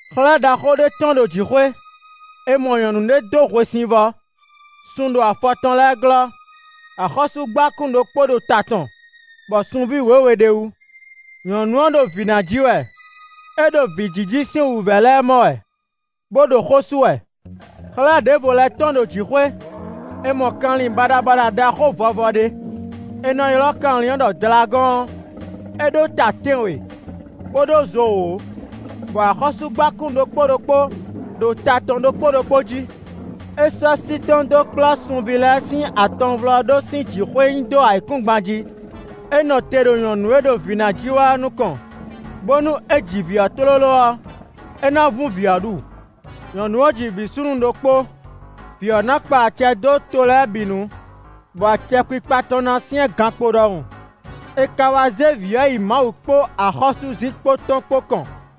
Xlɛ̌ ɖaxó ɖé tɔ́n ɖo jǐxwé: è mɔ nyɔ̌nu ɖé dó hwesivɔ́; sun ɖo afɔ tɔn lɛ́ɛ glɔ́; axɔ́súgbákún ɖokpó ɖo ta tɔn bɔ sunví wěwe ɖ'é wú. Nyɔ̌nu ɔ́ ɖo vǐ ná ji wɛ; é ɖo vǐjiji sín wǔvɛ́ lɛ́ɛ mɔ wɛ, bó ɖo xó sú wɛ. Xlɛ̌ ɖěvo lɛ́ tɔ́n ɖo jǐxwé: è mɔ kanlin baɖabaɖa ɖaxó vɔvɔ ɖé; è nɔ ylɔ́ kanlin ɔ́ ɖɔ Dlagɔ́ɔn; é ɖó ta tɛ́nwe, bó ɖó zo wǒ, bɔ axɔ́súgbákún ɖokpó ɖokpó ɖo ta tɔn ɖokpó ɖokpó jí. É sɔ́ sí tɔn dó kplɔ́ sunví lɛ́ɛ sín atɔnvlɔ́ɖó sín jǐxwé nyi dó ayǐkúngban jí. É nɔ te ɖo nyɔ̌nu e ɖo vǐ ná ji wɛ ɔ́ nukɔn, bónú é ji vǐ ɔ́ tlóló ɔ́, é ná vún vǐ ɔ́ ɖu. Nyɔ̌nu ɔ́ ji vǐ súnnu ɖokpó. Vǐ ɔ́ ná kpa acɛ dó to lɛ́ɛ bǐ nu, bɔ acɛkpikpa tɔn ná syɛ́n gankpo ɖɔhun. È ka wá zé vǐ ɔ́ yi Mawu kpó axɔ́súzinkpo tɔn kpó kɔn;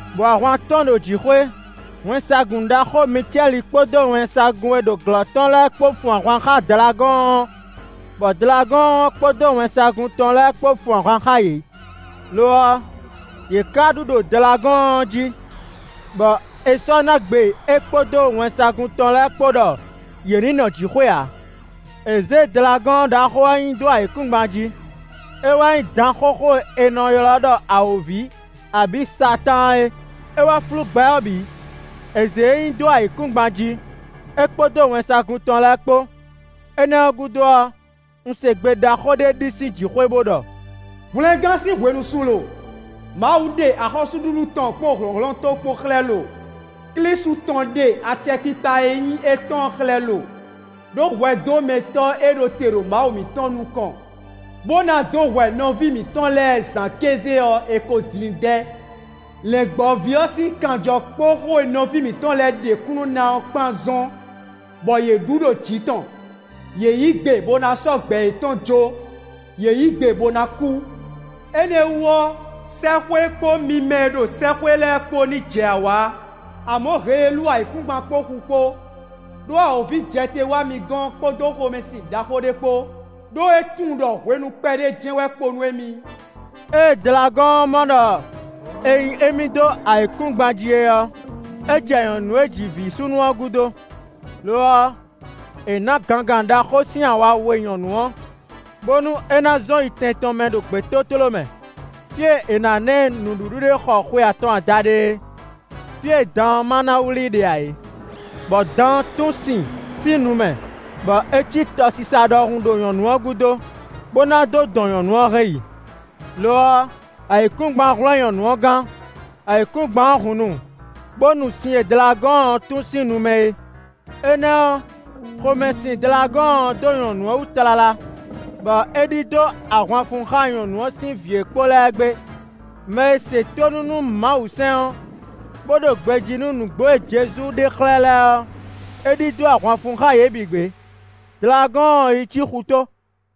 Bɔ ahwan tɔ́n ɖo jǐxwé: wɛnsagun ɖaxó Micɛ́li kpódó wɛnsagun e ɖo glɔ́ tɔn lɛ́ɛ kpó fun ahwan xá Dlagɔ́ɔn ɔ́, bɔ Dlagɔ́ɔn ɔ́ kpódó wɛnsagun tɔn lɛ́ɛ kpó fun ahwan xá yě. Lo ɔ́, yě ka ɖu ɖo Dlagɔ́ɔn ɔ́ jí, bɔ è sɔ́ ná gbe é kpódó wɛnsagun tɔn lɛ́ɛ kpó ɖɔ yě ní nɔ jǐxwé ǎ. È zě Dlagɔ́ɔn ɖaxó ɔ́ nyi dó ayǐkúngban jí; é wɛ nyí dan xóxó e è nɔ ylɔ́ ɖɔ awǒvi abǐ Satáan é; é wɛ flú gbɛ ɔ́ bǐ. È zě e nyi dó ayǐkúngban jí, é kpódó wɛnsagun tɔn lɛ́ɛ kpó. Énɛ́ ɔ́ gúdo ɔ́, un se gbe ɖaxó ɖé ɖi sín jǐxwé bó ɖɔ: “Hwlɛngán sín hwenu su lo! Mawu ɖe axɔ́súɖuɖu tɔn kpó hlɔ̌nhlɔ́n tɔn kpó xlɛ́ lo! Klísu tɔn ɖe acɛkpikpa e nyí étɔn ɔ́ xlɛ́ lo! Đó hwɛdómɛtɔ́ e ɖo te ɖo Mawu mǐtɔn nukɔn bó ná dó hwɛ nɔví mǐtɔn lɛ́ɛ zǎn kéze ɔ́, è ko zin i dɛ́. Lɛ̌ngbɔ́ví ɔ́ sín kanjɔ kpó xó e nɔví mǐtɔn lɛ́ɛ ɖe kúnnu ná ɔ́ kpán zɔ́n bɔ yě ɖu ɖo jǐ tɔn. Yě yí gbe bó ná sɔ́ gbɛ yětɔn jó; yě yí gbe bó ná kú. Énɛ́ wú ɔ́, sɛ́xwé kpó mi mɛ e ɖo sɛ́xwé lɛ́ɛ kpó ní jɛ awǎ. Amɔ̌ heelú ayǐkúngban kpó xu kpó. Đó awǒvi jɛ te wá mi gɔ́n kpódó xomɛsin ɖaxó ɖé kpó, ɖó é tunwun ɖɔ hwenu kpɛɖé jɛ́n wɛ kpo nú émí.” Ée Dlagɔ́ɔn ɔ́ mɔ ɖɔ è nyi émí dó ayǐkúngban jí é ɔ́, é jɛ nyɔ̌nu e ji vǐ súnnu ɔ́ gúdo. Lo ɔ́, è nǎ gangan ɖaxó sín awa we nyɔ̌nu ɔ́, bónú é ná zɔn yi tɛn tɔn mɛ ɖo gbětótló mɛ, fí e è nǎ ná ɛ nǔɖuɖu ɖe xɔ xwe atɔn adaɖé é; fí e dan ɔ́ ma ná wlí i ɖe ǎ é. Bɔ dan ɔ́ tún sin sín nu mɛ bɔ é cí tɔsisa ɖɔhun ɖo nyɔ̌nu ɔ́ gúdo, bó ná dó dɔn nyɔ̌nu ɔ́ hɛn yi. Lo ɔ́, ayǐkúngban hwlɛ́n nyɔ̌nu ɔ́ gán: ayǐkúngban ɔ́ hun nu, bó nu sin e Dlagɔ́ɔn ɔ́ tún sín nu mɛ é. Énɛ́ ɔ́, xomɛ sin Dlagɔ́ɔn ɔ́ dó nyɔ̌nu ɔ́ wú tlala, bɔ é ɖidó ahwan fun xá nyɔ̌nu ɔ́ sín vǐ e kpo lɛ́ɛ gbé; mɛ e se tónú nú Mawusɛ́n ɔ́, bó ɖo gbejí nú nǔgbó e Jezu ɖe xlɛ́ lɛ́ɛ ɔ́, é ɖidó ahwan fun xá yě bǐ gbé. Dlagɔ́ɔn ɔ́ yi cí xutó.